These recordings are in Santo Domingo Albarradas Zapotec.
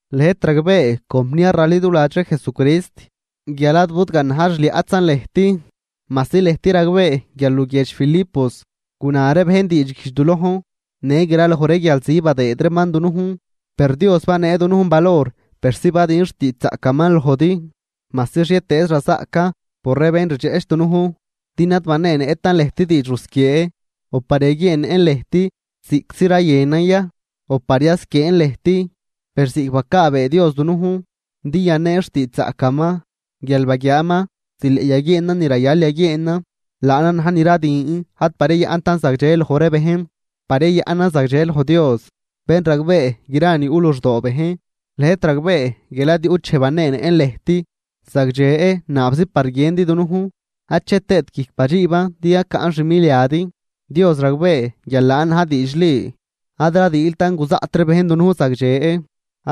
Lëjt ragbee, compniar raliduladx ree Jesucrist, guial ad budganaj xliaꞌtzan lëjt, majsi lëjt ragbee guial luguiedx Filipos guna ree bejn diidxguijdx du lojn në graloj ree guialzi badëëd reeman dunujn. Per Dios banee dunujn valor persi badün xtiidxzaꞌcaman lojdi, majsi xhietëëz razaꞌcan por ree bén rdxeꞌch dunujn. Din ad baneenëꞌtan lëjt diidx rusquiee, o par yaguieennëꞌn lëjt ziꞌctzi rayënan ya, o par yasquieen lëjt, per ziꞌc bacaabee Dios dunujn din yaneen xtiidxzaꞌcaman guial baguiaaman zileꞌ yaguieenan ni rayal yaguieenan, laanan na̱j ni radün ad par yayaꞌntan zagdxe loj ree bejn, par yayaꞌnan zagdxe loj Dios, bén ragbee gra ni yuꞌ luxdoo bejn. Lëjt ragbee guial ad yuꞌt dxej baneenëꞌn lëjt zagdxe naabzi par guiëndi dunujn, ache tëët guijc badxiiban din yacaꞌn xmiliadi. Dios ragbee guial laan na̱j diidxli. Ad radiiltan guzaꞌt ree bejn dunujn zagdxe,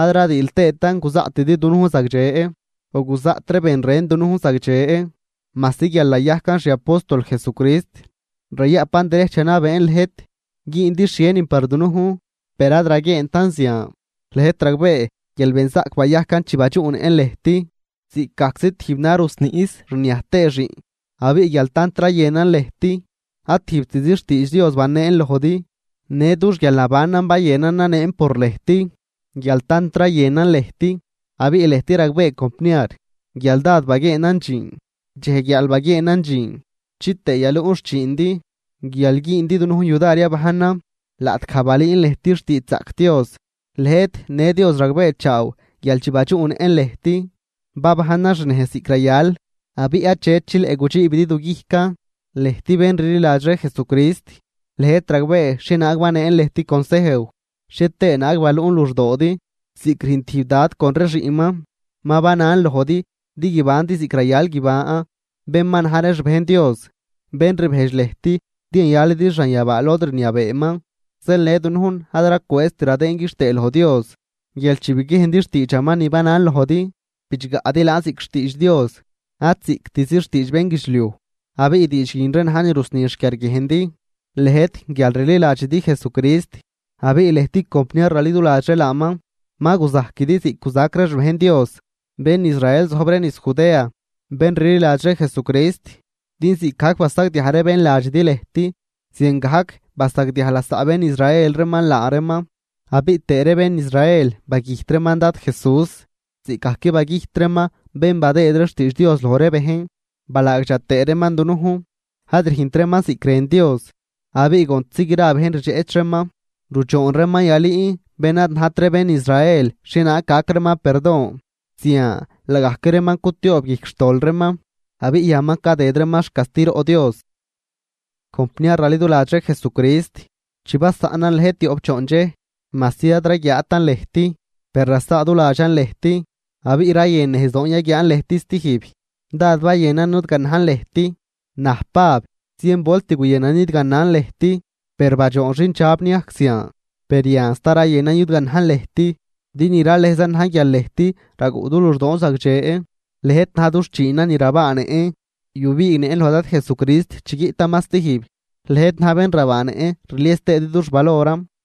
ad radiil tëëtan guzaꞌtidi dunujn zagdxe, o guzaꞌt ree ben ren dunujn zagdxe, majsi guial nayajcan xiapóstol Jesucrist, rayaꞌpan derejch yanabeen lëjt güündi xhienin par dunujn, per ad raguieentan zian. Lëjt ragbee guial benzaꞌc bayajcan chi badxuꞌnëꞌn lëjt, ziꞌcgajczi tijb na rusniꞌs rniaj tëë xiꞌn. Abiꞌ guial tant rayënan lëjt, ad tijbtzi xtiidx Dios baneen lojdi, në dux guialnabanan bayënan naneen por lëjt, guial tant rayënan lëjt. Abiꞌ lëjt ragbee compniar, guial dád baguieenan dxiin. Dxej guiaal baguieenan dxiin, chitëë yaluꞌn xchiindi guial güündi dunujn yudar yabajnan laꞌtgaj balüün lëjt xtiidxzaꞌc Dios. Lëjt në Dios ragbeechaaw guial chi badxuꞌnëꞌn lëjt, babajnan xnejz ziꞌc rayal, abiꞌ achet chileꞌ gudxiibidi du guijcan, lëjt bén rliladx ree Jesucrist. Lëjt ragbee xhienaag baneen lëjt consejw, xhie tëë naag baluꞌn luxdoodi ziꞌc rüjn tijb dad con ree xiꞌnman. Ma banan lojdi din guibandi ziꞌc rayal guiban bén ma na̱j ree xbejn Dios, bén rbejdx lëjt din yayalidi xanyabaa lod rniabeeman. Zeel në dunujn ad racwëëzt radëën quixtëë loj Dios, guial chi biguiejndi xtiidxaman ni banan lojdi, bidxgaꞌdi laan ziꞌc xtiidx Dios ad ziꞌctzi xtiidx bénguidxliuj. Abiꞌ diidx guin ree na̱j ni rusni xquiarguiejndi, lëjt guial rliladxidi Jesucrist. Abiꞌ lëjt compniar raliduladx ree laaman, ma guzajquidi ziꞌc guzac ree xbejn Dios, bén Israel zojb ree niz Judea, bén rliladx ree Jesucrist. Din ziꞌcgajc basagdiaj ree bén ladxidi lëjt, ziangajc basagdiaj lasaꞌ bén Israel reeman laa reeman. Abiꞌ tëë ree bén Israel bagüjt reeman Dad Jesús, ziꞌcgajc bagüjt reeman bén badëëd ree xtiidx Dios loj ree bejn, balaagdxa tëë reeman dunujn, ad rüjnt reeman ziꞌc rën Dios, abiꞌ contzi gra bejn rdxeꞌch reeman. Rudxoon reeman yalüün bén ad najt ree bén Israel xhienaag gac reeman perdon, zian laagajc reeman cutioob guijc xtol reeman, abiꞌ yan ma cadëd reeman xcastiroꞌ Dios. Compniar raliduladx ree Jesucrist, chi basaꞌnan lëjt tioꞌp choondxej, majsi ad raguiaatan lëjt, per rasaaduladxan lëjt, abiꞌ rayën nejzdoon yaguiaan lëjt stijb. Dád bayënan nudganajn lëjt. Naj Pab, zien volt daꞌt guyënan nidganan lëjt, per badxoon xindxab niajc zian. Per yan sta rayënan yudganajn lëjt, din ni ralëjzan na̱j guial lëjt raguꞌ du luxdoon zagdxe. Lëjt na̱j dux chiinan ni rabaanëꞌn yubiignëꞌn loj Dad Jesucrist chi guiꞌtaman stijb. Lëjt na̱j bén rabaanëꞌn rlies tëëdi dux valoran.